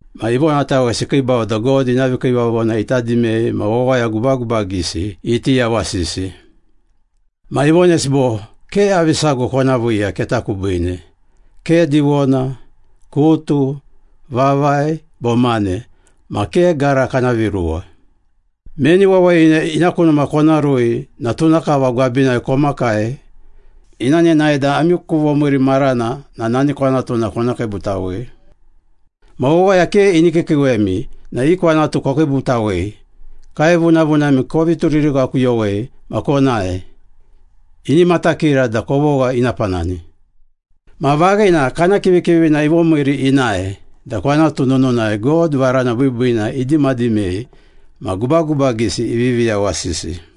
Ma ivonatawesi ikiibau da God ina vikiivavona ita dimei ma wawaya gubagubagisi iti yawasisi. Ma ivonesi bo, “Ke avi sago kona viiya keta kubiine. Ke diwona, kutu, vavai, bo mane, ma ke gara kana viruwa. Meni wawayina ina ku numa kona rui na tuna kava gwabinai komakai ina nenae da ami ku vomiiri marana na nani kwanatuna kona kiibutawei. Ma wawaya ke ini kiikiiwemi na i kwanatu kokiibutawei, kaevunavunami kovi turirighakuyowei ma konae. Ini matakira da kovogha ina panani.” Ma vaghina kana kivikivina ivomiiri inae da kwanatu nununai God varana biibiina idimadimei ma gubagubagisi ivivi yawasisi.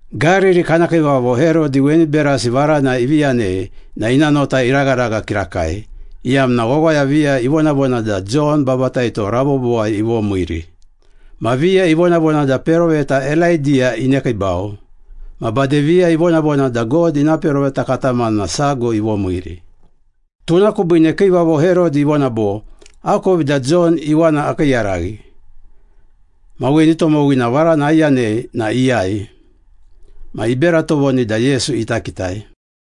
Gariri kana kiivavo Herodi weni berasi varana ivi yanei na ina nota iragharagha kirakai, iyamna wawaya viya ivonavona da Jon Babataito rabobowai ivomiiri, ma viya ivonavona da peroveta Elaidiya inekiibau, ma bade viya ivonavona da God ina peroveta katamana sago ivomiiri. Tuna kubiine kiivavo Herodi ivona bo, “Akovi da Jon iwana akiiyaraghi. Ma weni tomowina varana aiyanei na iyai?” Ma ibera tovoni da Yesu ita kitai.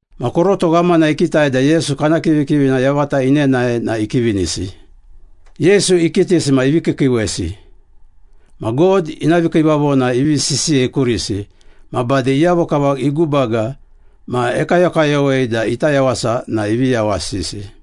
Ma koroto ghamana ikitai da Yesu kana kivikivina yavata inenae na ikivinisi. Yesu ikitisi ma ivi kiikiiwesi. Ma God ina vikiivavona ivi sisiyei kurisi, ma bade iyavo kava igubaga ma ekayokayowei da ita yawasa na ivi yawasisi.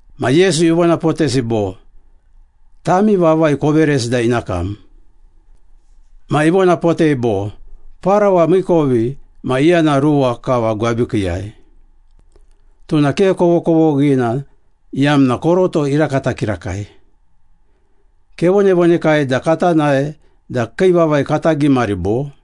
Ma Yesu ivonapotesi bo, “Tami vavai koveresi da ina kam.” Ma ivonapotei bo, “Parawa miikovi ma iyana ruwa kava gwabikiiyai. Tuna ke kovokovoghina iyamna koroto irakata kirakai. Kevonavonekai da kata nae da kii vavai kata gimari bo?”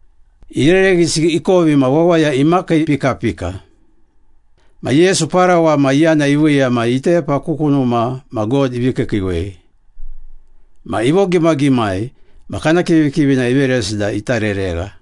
Irereghisi ikovi ma wawaya imakiipikapika. Ma Yesu parawa ma iyana iviiya ma itepa ku kunuma ma God ivi kiikiiwei. Ma ivogimagimai ma kana kivikivina iveresi da ita reregha.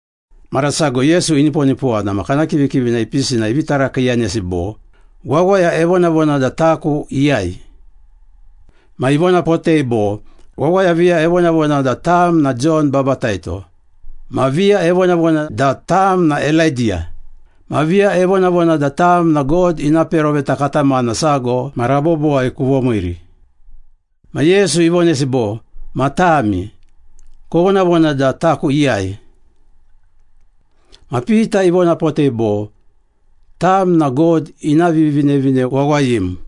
Mara sago Yesu iniponipowana ma kana kivikivina ipisi na ivi tarakiiyanesi bo, “Wawaya evonavona da taku iyai?” Ma ivonapotei bo, “Wawaya viya evonavona da tam na Jon Babataito, ma viya evonavona da tam na Elaidiya, ma viya evonavona da tam na God ina peroveta katamana sago ma rabobowai kuvomiiri.” Ma Yesu ivonesi bo, “Ma tami, kovonavona da taku iyai?” Ma Pita ivonapotei bo, “Tam na God ina Vivinevine Wawayim.”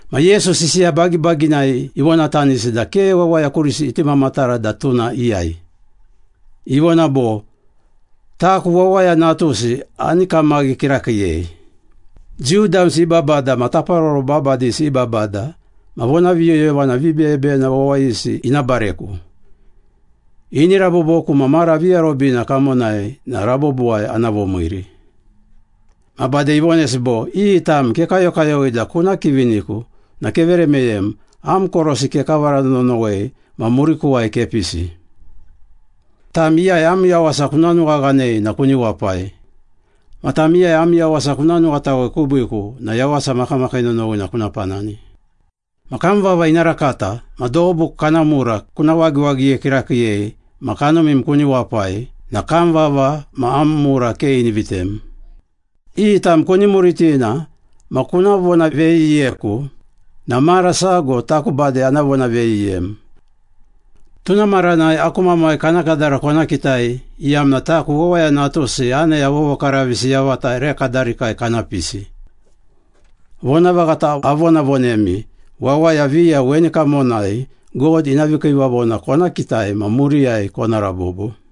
Ma Yesu sisiya bagibaginai ivonatanisi da ke wawaya kurisi iti mamatara da tuna iyai. Ivona bo, “Taku Wawaya Natusi ani kamaghi kirakiiyei. Jiu damsi i babada ma taparoro babadisi i babada ma vonaviyoyovana vibeyebeyena wawayisi ina bareku. Ini raboboku ma mara viarobina kamonai na rabobowai ana vomiiri.” Ma bade ivonesi bo, “Iyi tam kekayokayowei da kuna kiviniku na kevere meyem, am korosi kekavara nonowei ma murikuwai kepisi. Tam iyai am yawasa kuna nuwaghanei na kuni wapai. Ma tam iyai am yawasa kuna nuwatawei kubiiku na yawasa makamakii nonowina kuna panani. Ma kam vava ina rakata ma dobu kana mura kuna wagiwagiye kirakiiyei ma kanumim kuni wapai na kam vava ma am mura ke ini vitem. Iyi tam kuni muritina ma kuna vonaveyiyeku na mara sago taku bade ana vonaveyiyem. Tuna maranai aku Mamai kana kadara kona kitai iyamna taku Wawaya Natusi aneya vovokaravisi yavata ere kadarikai kana pisi. Vonavaghata avonavonemi, wawaya viya weni kamonai God ina vikiivavona kona kitai ma muriyai kona rabobo.”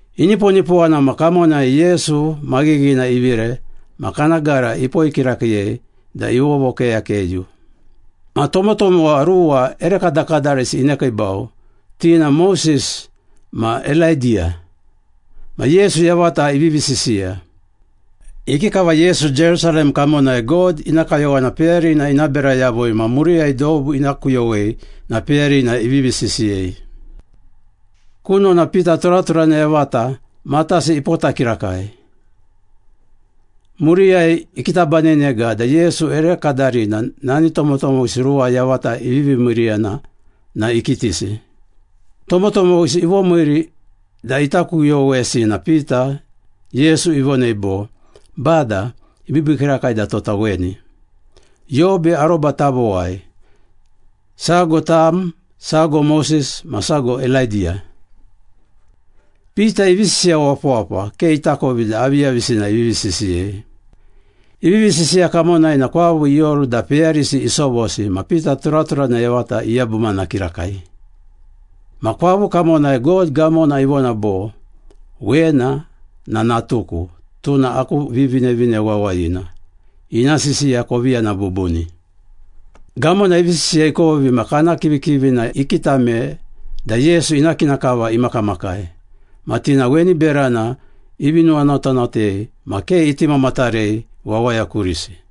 Iniponipowana ma kamonai Yesu maghighina ivire ma kana gara ipoi kirakiiyei da ivovokeyakeyu. Ma tomotomowa ruwa ere kadakadarisi inekiibau, ti na Moses ma Elaidiya, ma Yesu yavata ivivi sisiya. Ikikava Yesu Jerusalem kamonai God ina kayowana peyarina ina bera yavui ma muriyai dobu ina kuyowei na peyarina ivivi sisiyei. Kunona Pita turaturana yavata, matasi ipota kirakai. Muriyai ikitabanenega da Yesu ere kadarina nani tomotomowisi ruwa yavata ivivi miiriyana na ikitisi. Tomotomowisi ivomiiri da ita kuyowesi na Pita, Yesu ivonei bo, “Bada, ibiibii kirakai da tota weni. Yobe aroba tavowai. Sago tam, sago Moses ma sago Elaidiya.” Pita ivi sisiya wapawapa, ke itakovi da aviyavisina ivivi sisiyei. Ivivi sisiya kamonai na kwavu ioru da peyarisi isovosi ma Pita turaturana yavata iyabumana kirakai. Ma kwavu kamonai God gamona ivona bo, “Wena na natuku, tuna aku Vivinevine Wawayina. Ina sisiya kovi yana bubuni.” Gamona ivi sisiya ikovi na kana kivikivina ikitame da Yesu ina kina kava imakamakai. Ma ti na weni berana ivi nuwanotanotei ma ke iti mamatarei wawaya kurisi.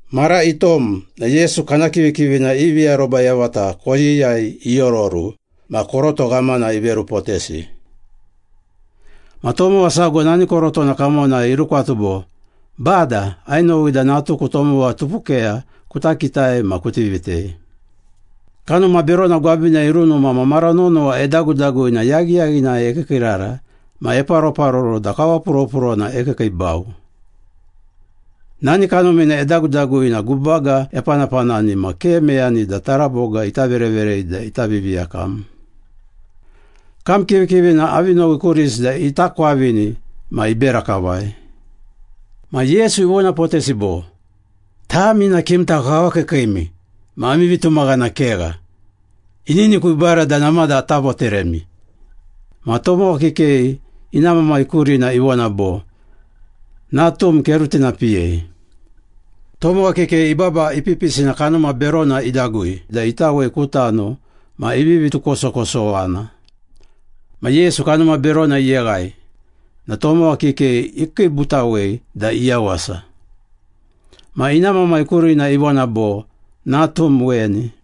Mara itom na Yesu kana kivikivina ivi aroba yavata koyiyai iororu ma koroto ghamana iverupotesi. Ma tomowa sago nani korotona kamonai irukwatu bo, “Bada, ainowi da natuku tomowa tupukeya kuta kitai ma kuti vitei. Kanuma berona gwabinai irunuma ma mara nonowa edagudagui na yaghiyaghinai ekiikiirara ma eparoparoro da kawapuropurona ekiikiibau. Nani kanumina edagudagui na gubaga epanapanani ma ke meyani da taraboga ita vereverei da ita viviyakam. Kam kivikivina avi nowi kurisi da ita kwavini ma ibera kavai.” Ma Yesu ivonapotesi bo, “Tami na kimta kawakiikiimi ma ami vitumaghana kegha. Ininiku ibara da namada ata voteremi.” Ma tomowa kikei ina mamai kurina ivona bo, “Natum kerutinapiyei.” Tomowa kikei ibaba ipipisi na kanuma berona idagui da itawei ku tano ma ivivi tukosokosowana. Ma Yesu kanuma berona iyeghai na tomowa kikei ikiibutawei da iyawasa. Ma ina mamai kurina ivona bo, “Natum weni.”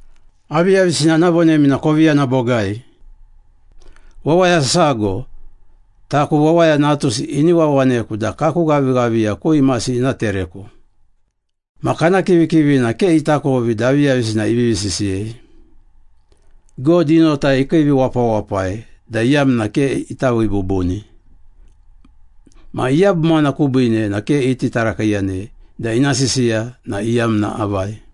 “Aviyavisina ana vonemi na kovi yana bogai. Wawaya sago, taku Wawaya Natusi ini wawaneku da kaku ghavighaviya ku imasi ina tereku.” Ma kana kivikivina ke itakovi da aviyavisina ivivi sisiyei, God i nota ikiiviwapawapai da iyamna ke ita vii bubuni. Ma iyabumana kubiine na ke iti tarakiiyanei da ina sisiya na iyamna avai.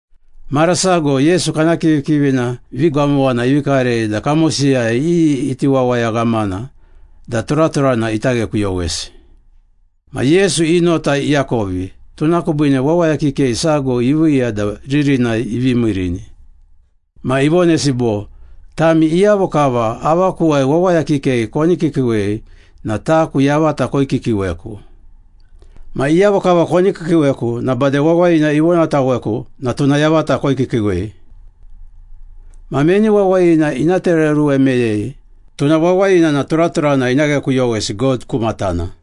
Mara sago Yesu kana kivikivina vigamowana ivi karei da kamosiyai iyi iti wawaya ghamana da turaturana ita ghekuyowesi. Ma Yesu i nota iakovi, tuna kubiine wawaya kikei sago iviiya da ririnai ivi miirini. Ma ivonesi bo, “Tami iyavo kava avakuwai wawaya kikei koni kiikiiwei na taku yavata koikiikiiweku. Ma iyavo kava koni kiikiiweku na bade wawayina ivonataweku na tuna yavata koikiikiiwei. Ma meni wawayina ina tereoruwe meyei, tuna wawayina na turaturana ina ghekuyowesi God ku matana.”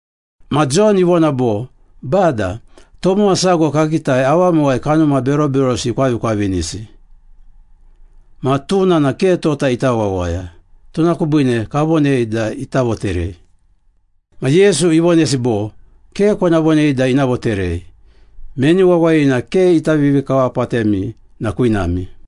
Ma Jon ivona bo, “Bada, tomowa sago kakitai, avamuwai kanuma beroberosi ikwavikwavinisi. Ma tuna na ke tota ita wawaya, tuna kubiine kavonei da ita voterei.” Ma Yesu ivonesi bo, “Ke kona vonei da ina voterei. Meni wawayina ke ita vivikawapatemi na kwinami.”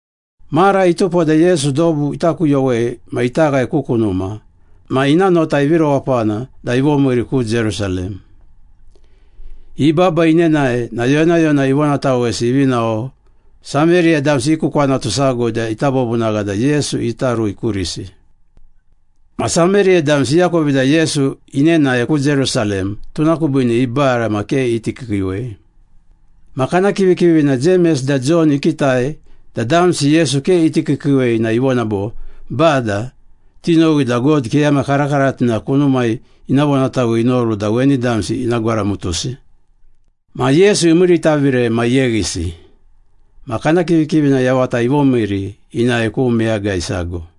Mara itupo da Yesu dobu ita kuyowei ma ita ghae ku kunuma, ma ina nota ivi rewapana da ivomiiri ku Jerusalem. Ibaba inenae na yonayona ivonatawesi ivi nao Sameriya damsi i ku kwanatu sago da ita vovunagha da Yesu ita rui kurisi. Ma Sameriya damsi iakovi da Yesu inenae ku Jerusalem, tuna kubiine ibara ma ke iti kiikiiwei. Ma kana kivikivina Jemes da Jon ikitai da damsi Yesu ke iti kiikiiwei na ivona bo, “Bada, tinowi da God keyama karakaratina kunumai ina vonatawei inoru da weni damsi ina gwaramutusi.” Ma Yesu imiiritavire ma iyeghisi. Ma kana kivikivina yavata ivomiiri inae ku meyagai sago.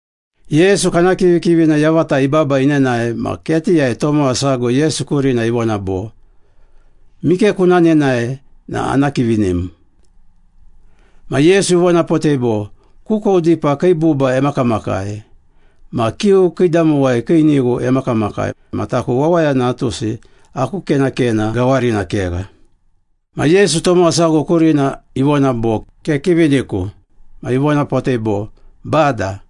Yesu kana kivikivina yavata ibaba inenae ma ketiyai tomowa sago Yesu kurina ivona bo, “Mike kuna nenae na ana kivinim.” Ma Yesu ivonapotei bo, “Kukou dipa kii buba emakamakai ma kiu kiidamowai kii nighu emakamakai ma taku Wawaya Natusi aku kenakena gawarina kegha.” Ma Yesu tomowa sago kurina ivona bo, “Kekiviniku.” Ma ivonapotei bo, “Bada,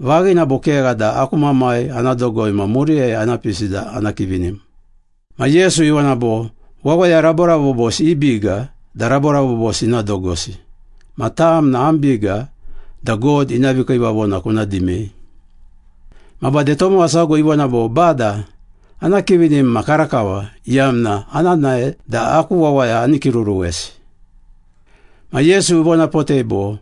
vaghina bo kegha da aku mamai ana dogoi ma muriyai ana pisi da ana kivinim.” Ma Yesu ivona bo, “Wawaya raborabobosi i biga da raborabobosi ina dogosi. Ma tam na am biga da God ina vikiivavona kuna dimei.” Ma bade tomowa sago ivona bo, “Bada, ana kivinim ma karakava, iyamna ana nae da aku wawaya ani kiruruwesi.” Ma Yesu ivonapotei bo,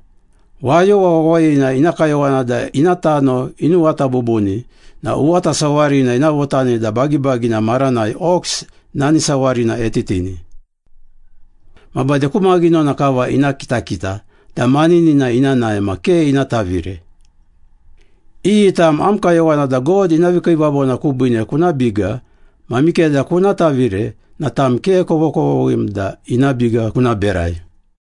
“Wayowa wawayina ina kayowana da ina tano inuwata bubuni na uwata sawarina ina votani da bagibagina maranai ox nani sawarina etitini. Ma bade ku maghinona kava ina kitakita da maninina ina nae ma ke ina tavire. Iyi tam am kayowana da God ina vikiivavona kubiine kuna biga ma mikeda kuna tavire na tam ke kovokovoghim da ina biga kuna berai.”